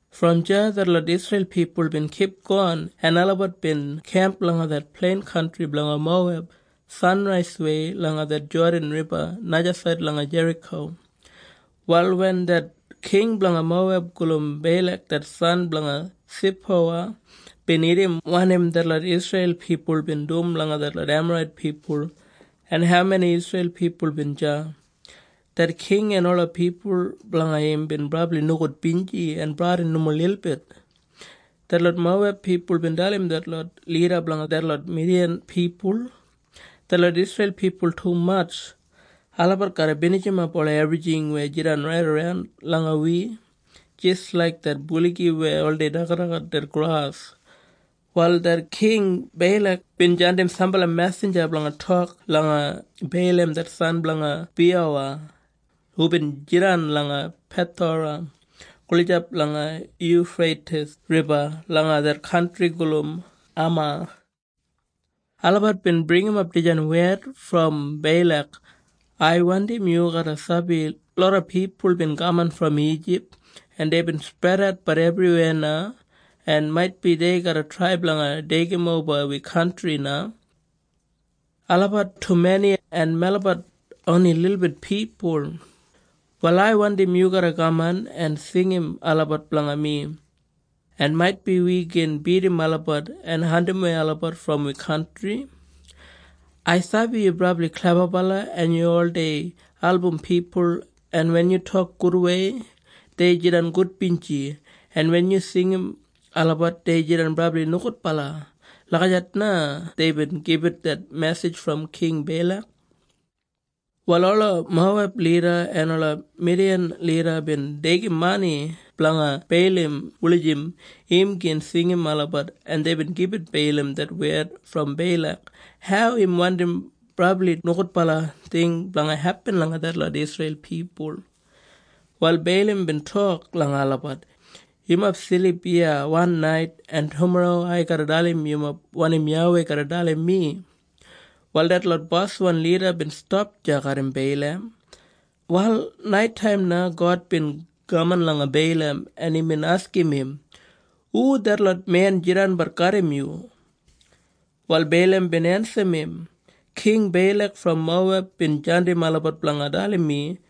Brom deya detlot Isreil pipul bin kipgon, en olabat bin kemp langa det plein kantri blanga Moweb, sanraiswei langa det Jodan Riba, najasaid langa Jeriko. Wal wen det king blanga Moweb gulum Beilak, det san blanga Sipowa, bin irrim wanim detlot Isreil pipul bin dum langa detlot Emarait pipul en haumeni Isreil pipul bin deya, det king en ola pipul blanga im bin brabli nogudbinji en bradin nomo lilbit. Detlot Moweb pipul bin dalim detlot lida blanga detlot Midiyan pipul, “Detlot Isreil pipul tumatj. Olabat garra binijimap ola ebrijing weya jidan raidaran langa wi, jis laik det buligi weya oldei dagadagat det gras.” Wal det King Beilak bin jandim sambala mesinja blanga tok langa Beilam det san blanga Biyowa, hubin jidan langa Pethora gulijap langa Yufreitis Riba langa det kantri gulum Amau. Olabat bin bringimap dijan wed brom Beilak, “Ai wandim yu garra sabi loda pipul bin kaman brom Ijip, en deibin spredatbat ebriweya na, en maitbi dei garra trai blanga deigimoba wi kantri na. Olabat tumeni en melabat oni lilbit pipul. Wal ai wandim yu garra kaman en singim olabat blanga mi, en maitbi wi gin bidim olabat en andimwei olabat brom wi kantri. Ai sabi yu brabli klebabala en yu oldei album pipul, en wen yu tok gudwei dei jidan gudbinji, en wen yu singim olabat dei jidan brabli nogudbala.” Lagijat na deibin gibit det mesij brom King Beilak. Wal ola Moweb lida, en ola Midiyan lida bin deigim mani blanga Beilam wulijim im gin singim olabat, en deibin gibit Beilam det wed brom Beilak hau im wandim brabli nogudbala ting blanga hepin langa detlot Isreil pipul. Wal Beilam bin tok langa olabat, “Yumob silip iya wan nait, en tumorro ai garra dalim yumob wanim YAWEI garra dalim mi.” Wal detlot boswan lida bin stap deya garram Beilam. Wal naitaim na God bin kaman langa Beilam en imbin askim im, “Hu detlot men jidanbat garram yu?” Wal Beilam bin ensim im, “King Beilak brom Moweb bin jandim olabat blanga dalim mi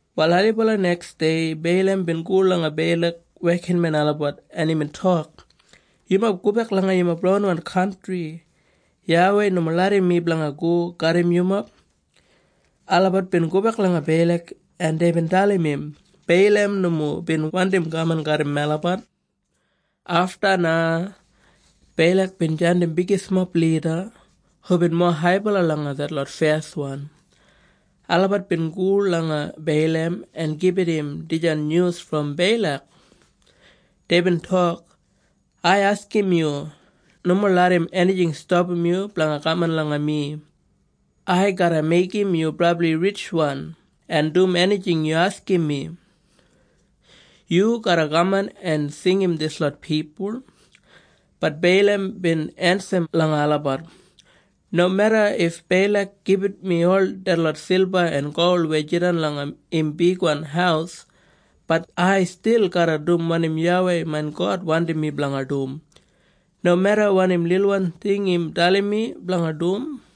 Wal ailibala neksdei, Beilam bin go langa Beilak wekinmen olabat en imbin tok, “Yumob gobek langa yumob ronwan kantri. YAWEI nomo larram mi blanga go garram yumob.” Olabat bin gobek langa Beilak en deibin dalim im Beilam nomo bin wandim kaman garram melabat. Afta na, Beilak bin jandim bigismob lida, hubin mowa haibala langa detlot feswan. Olabat bin go langa Beilam en gibit im dijan nyus brom Beilak. Deibin tok, “Ai askim yu, nomo larram enijing stapam yu blanga kaman langa mi. Ai garra meigim yu brabli ritjwan en dum enijing yu askim mi. Yu garra kaman en singim dislot pipul.” Bat Beilam bin ensim langa olabat, “Nomeda if Beilak gibit mi ol detlot silba en gol weya jidan langa im bigwan haus, bat ai stil garra dum wanim YAWEI main God wandim mi blanga dum, nomeda wanim lilwan ting im dalim mi blanga dum.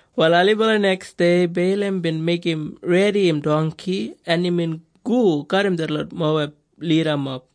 Wal ailibala neksdei Beilam bin meigim redi im dongki en imbin go garram detlot Moweb lidamob.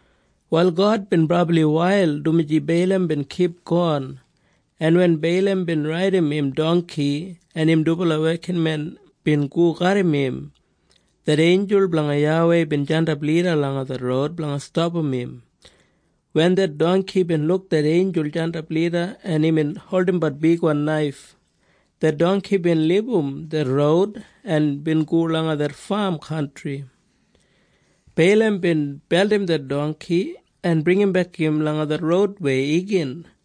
Wal God bin brabli wail, dumaji Beilam bin kipgon, en wen Beilam bin raidim im dongki, en im dubala wekinmen bin go garram im, det einjul blanga YAWEI bin jandap lida langa det roud blanga stapam im. Wen det dongki bin luk det einjul jandap lida en imbin holdimbat bigwan naif, det dongki bin libum det roud en bin go langa det fam kantri. Beilam bin beldim det dongki en bringimbek im langa det roudwei igin.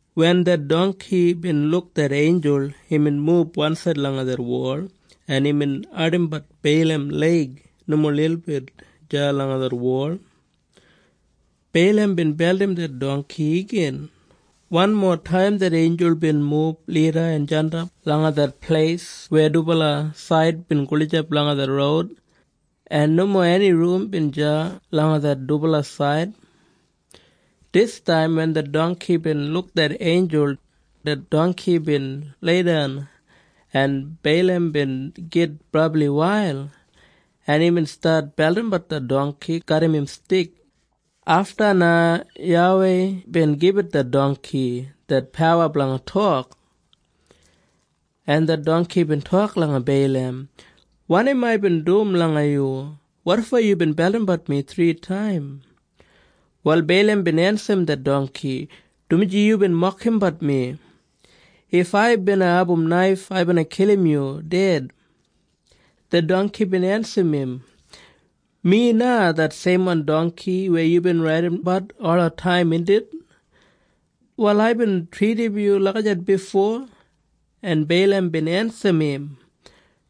Wen det dongki bin luk det einjul, imbin mub wansaid langa det wol en bin ardimbat Beilam leig nomo lilbit deya langa det wol. Beilam bin beldim det dongki igin. Wanmotaim det einjul bin mub lida en jandap langa det pleis weya dubala said bin gulijap langa det roud, en nomo eni rum bin deya langa det dubala said. Distaim wen det dongki bin luk det einjul, det dongki bin leidan en Beilam bin git brabli wail, en imbin stat beldimbat det dongki garram im stik. Afta na YAWEI bin gibit det dongki det pawa blanga tok. En det dongki bin tok langa Beilam, “Wanim aibin dum langa yu? Wotfo yubin beldimbat mi thritaim?” Wal Beilam bin ensim det dongki, “Dumaji yubin mokimbat mi. If ai bina abum naif, ai bina kilim yu ded.” Det dongki bin ensim im, “Mi na det seimwan dongki weya yubin raidimbat olataim, indit? Wal aibin tridim yu lagijat bifo?” En Beilam bin ensim im,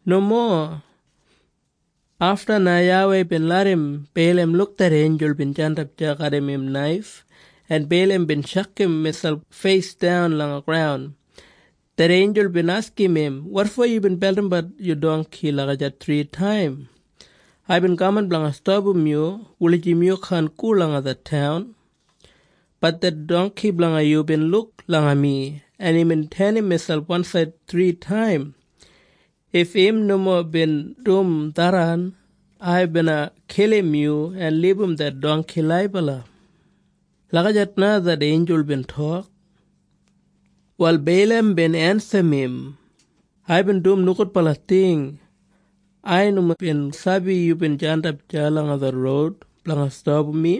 “Nomo.” Afta na YAWEI bin larram Beilam luk det einjul bin jandap deya garram im naif, en Beilam bin tjakam miselp feisdan langa graun. Det einjul bin askim im, “Wotfo yubin beldimbat yu dongki lagijat thritaim? Aibin kaman blanga stapam yu, wulijim yu kaan go langa det taun. Bat det dongki blanga yu bin luk langa mi en imbin tenim miselp wansaid thritaim. If im nomo bin dum tharran, ai bina kilim yu en libum det dongki laibala.” Lagijat na det einjul bin tok. Wal Beilam bin ensim im, “Aibin dum nogudbala ting. Ai nomo bin sabi yubin jandap deya langa det roud blanga stapam mi.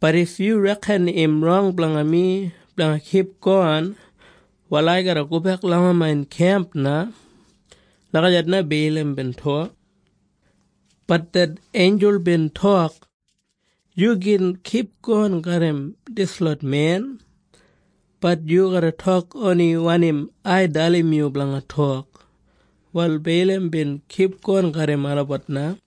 Bat if yu reken im rong blanga mi blanga kipgon, wal ai garra gobek langa main kemp na.” Lagijat na Beilam bin tok. Bat det einjul bin tok, “Yu gin kipgon garram dislot men, bat yu garra tok oni wanim ai dalim yu blanga tok.” Wal Beilam bin kipgon garram olabat na.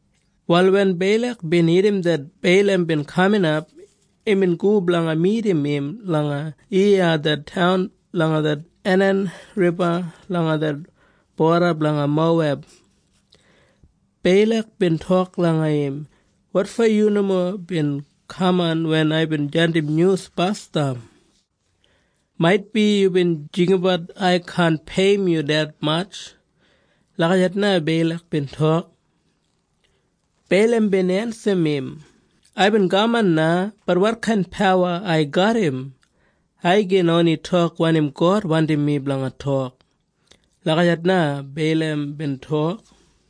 Wal wen Beilak bin irrim det Beilam bin kaminap, imbin go blanga midim im langa Eiya det taun langa det Anan Riba langa det boda blanga Moweb. Beilak bin tok langa im, “Wotfo yu nomo bin kaman wen aibin jandim nyus basdam? Maitbi yubin jinggabat ai kaan peiyim yu detmatj?” Lagijat na Beilak bin tok. Beilam bin ensim im, “Aibin kaman na, bat wotkain pawa ai garram? Ai gin oni tok wanim God wandim mi blanga tok.” Lagijat na Beilam bin tok.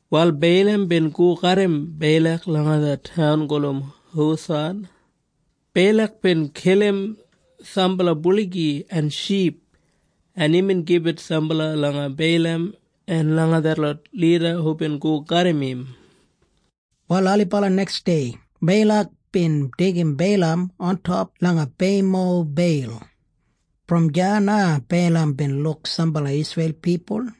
Wal Beilam bin go garram Beilak langa det taun gulum Husath. Beilak bin kilim sambala buligi en ship, en imbin gibit sambala langa Beilam en langa detlot lida hubin go garram im. Wal ailibala neksdei Beilak bin deigim Beilam ontop langa Beimobeil. Brom deya na Beilam bin luk sambala Isreil pipul.